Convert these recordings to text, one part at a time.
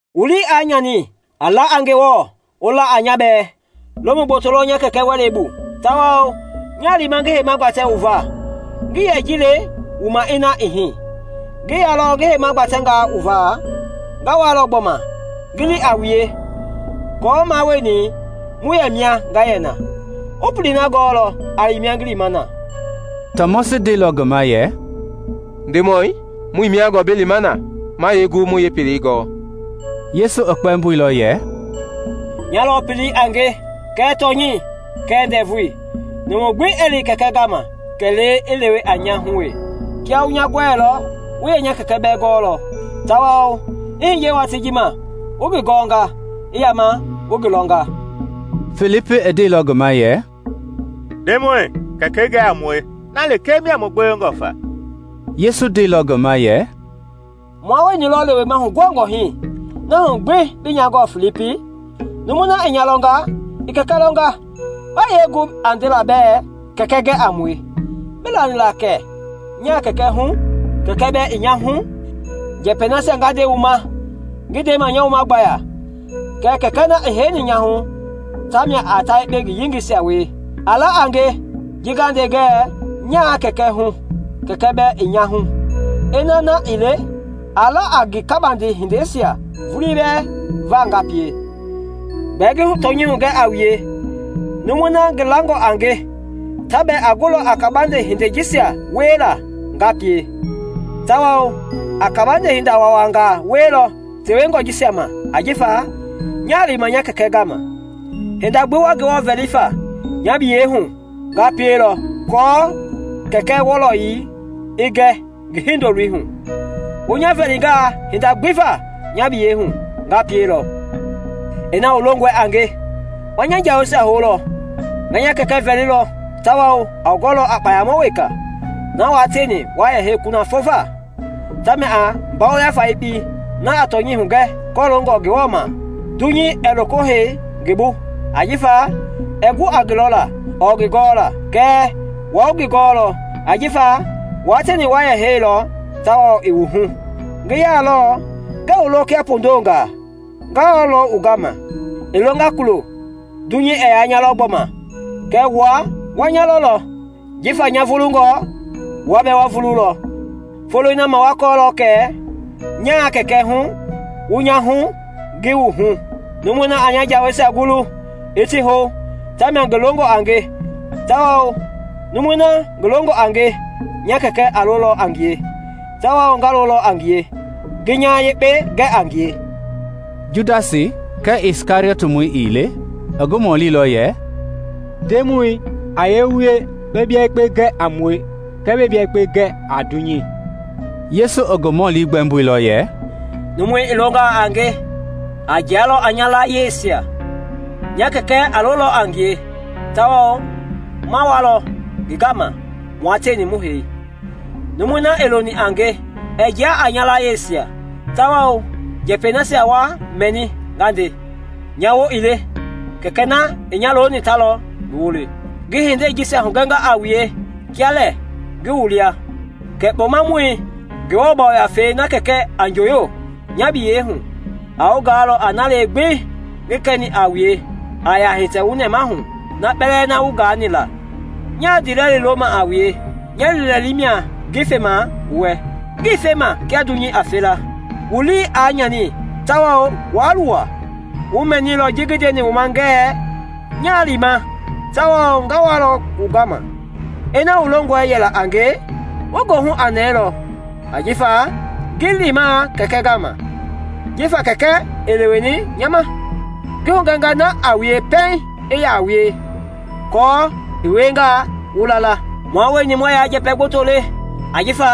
“Wu lii aa nyani; a la a Ngewɔ, wu la a nya bɛɛ. Lomu gboto lɔ nya Kɛkɛ wɛlei bu, tawao nyaa lima ngi heima gbatɛ wu va. Ngii yɛ ji le wu ma ina ii hii. Ngi yaalɔ ngi heima gbatɛ wu va, nga walɔ gbɔma ngi li a wue aako mua wueni mu yɛ mia nga yɛ na. Wu pelei na gɔɔlɔ a li mia ngi lima na.” Tɔmɔsi ndeilɔ ngi ma yɛ, “Ndemɔi, muii mia gɔɔ bi lima na; ma yee gu mu yeepelei gɔ?” Yesu i kpɛmboilɔ yɛ, “Nya lɔ pelei a nge kɛɛ tɔnyɛi kɛɛ ndɛvui; numu gbi ɛɛ li Kɛkɛi gama kɛlee i lewe a nya hu wee. Kiaa wu nya gɔɛilɔ, wu yɛ nya Kɛkɛ bɛɛ gɔlɔ; tawao i hiye watii ji ma, wu ngi gɔnga, i yama wu ngi lɔnga.” Filipi i ndeilɔ ngi ma yɛ, “Ndemɔi, Kɛkɛi gɛ a mue; na lekee mia mu gbewengɔ famia.” Yesu ndeilɔ ngi ma yɛ, “Mua wueni lɔ lewema huguhangɔ hii, na hu gbi bii nya gɔɔ, Filipi? Numui na i nya lɔnga, i Kɛkɛi lɔnga; ba yee gu a ndela bɛɛ ‘Kɛkɛi gɛ a mue’? Bii lani la kɛ nyaa Kɛkɛi hu, Kɛkɛi bɛɛ i nya hu? Njɛpɛi nasia nga nde wu ma ngii ndema a nya wuma gbaya; kɛɛ Kɛkɛi na i heini nya hu tamia a ta yekpe ngi yengeisia wie. A la a nge ji nga nde ngɛ nyaa Kɛkɛi hu, Kɛkɛi bɛɛ i nya hu; ina na ii le, a la a nge kabande hindeisia vulii bɛɛ va nga pie. Gbɛɛ ngi tɔnyɛi hugɛ a wue, numui na ngi langɔ a nge, ta bɛɛ a gulɔ a kabande hindei jisia wiela nga pie; tawao a kabande hinda waawanga wielɔ tewengɔ jisia ma ajifa nyaa lima nya Kɛkɛi gama. Hinda gbi wa Ngewɔ vɛli fa nya biyei hu, nga pielɔ aako Kɛkɛi wɔlɔyei i gɛ ngi Hindoloi hu; Wu nya vɛlingaa hinda gbi va nya biyɛi hu, nga pielɔ. “Ina wu longɔi a nge, wa nya jaweisia houlɔ. Nga Kɛkɛi vɛlilɔ tawao a wu gɔlɔ a Kpɔmamɔ weka na wua tieni wa hei kunafɔ va. Tamia a Ngafei na a tɔnyɛi hugɛ kɔloongɔ Ngewɔ ma. Dunyei ɛɛ loko hei ngi bu ajifa ɛɛ gu a ngi lɔla ɔɔ ngi gɔla. Kɛɛ wua wu ngi gɔɔlɔ, ajifa wua tieni wa yɛ heinilɔ tawao i wu hu. “Ngi yaalɔ, ngɛɛ wu lo kia pondongaa; nga walɔ wu gama. I longa kulo, dunyei ɛɛ yaa nya lɔ gbɔma, kɛɛ wua wa nya lɔlɔ; jifa nya vulungɔ, wua bɛɛ wa vululɔ. Foloi na ma wa kɔɔlɔ kɛ nyaa Kɛkɛi hu, wu nya hu, ngi wu hu. “Numui na a nya jaweisia gulu, i ti hou, ta mia ngi longɔ a nge; tawao numui na ngi longɔ a nge, nya Kɛkɛ a lolɔ a ngie, tawao nga lolɔ a ngie ngi nya yekpe gɛ a ngie.” Judas, kɛɛ Kɛriɔtmɔi ii le, i ngi mɔlilɔ yɛ, “Ndemɔi, a yee wie bi bia yekpe gɛ a mue kɛɛ bɛɛ bia yekpe gɛ a dunyei?” Yesu i ngi mɔli gbɛmboilɔ yɛ, “Numu i longaa a nge, a jialɔ a nya layieisia; nya Kɛkɛ a lolɔ a ngie tawao ma walɔ ngi gama mua tieni mu hei. Numui na ii loni a nge ɛɛ jia a nya layieisia, tawao, njɛpɛi nasia wa mɛni nga nde, nya woo ii le, Kɛkɛi na i nya loni ta lɔ ngi woo le. “Ngi hindei jisia hugɛnga a wue kia lɛ ngi wu lia. Kɛɛ Kpɔmamɔi, Ngewɔ Yafei, na Kɛkɛi a njooyo nya biyɛi hu, a wu gaalɔ a nalee gbi ngi kɛni a wue a yaa hitɛ wu nɛmahu na kpɛlɛɛ na wu gaani la. “Nyaa ndiilɛli loma a wue; nya liilɛli mia ngi fema wu wɛ; ngii fema kia dunyei a fe la. Wu lii aa nyani tawao waa luwa. Wu mɛnilɔ ji ngi ndeni wu ma ngɛɛ, ‘Nyaa lima tawao nga walɔ wu gama.’ Ina wu longɔ yɛla a nge, wu goohu aa nɛɛlɔ, ajifa ngi lima Kɛkɛi gama; jifa Kɛkɛi i leweni nya ma. Ngi hugɛnga na a wue pɛiŋ i yaa wie, aako i wiengaa, wu la la. Mua wueni muɛɛ yaa njɛpɛ gboto le, ajifa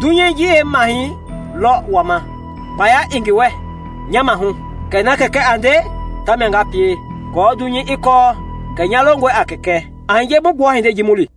dunyei ji yeemahɛi lɔ wama. Kpaya ii ngi wɛ nya maahu; kɛɛ na Kɛkɛi a nde ta mia nga pie, aako dunyei i kɔɔ kɛ nya longɔe a Kɛkɛi. “A hiye mu gbua hindei ji mu li.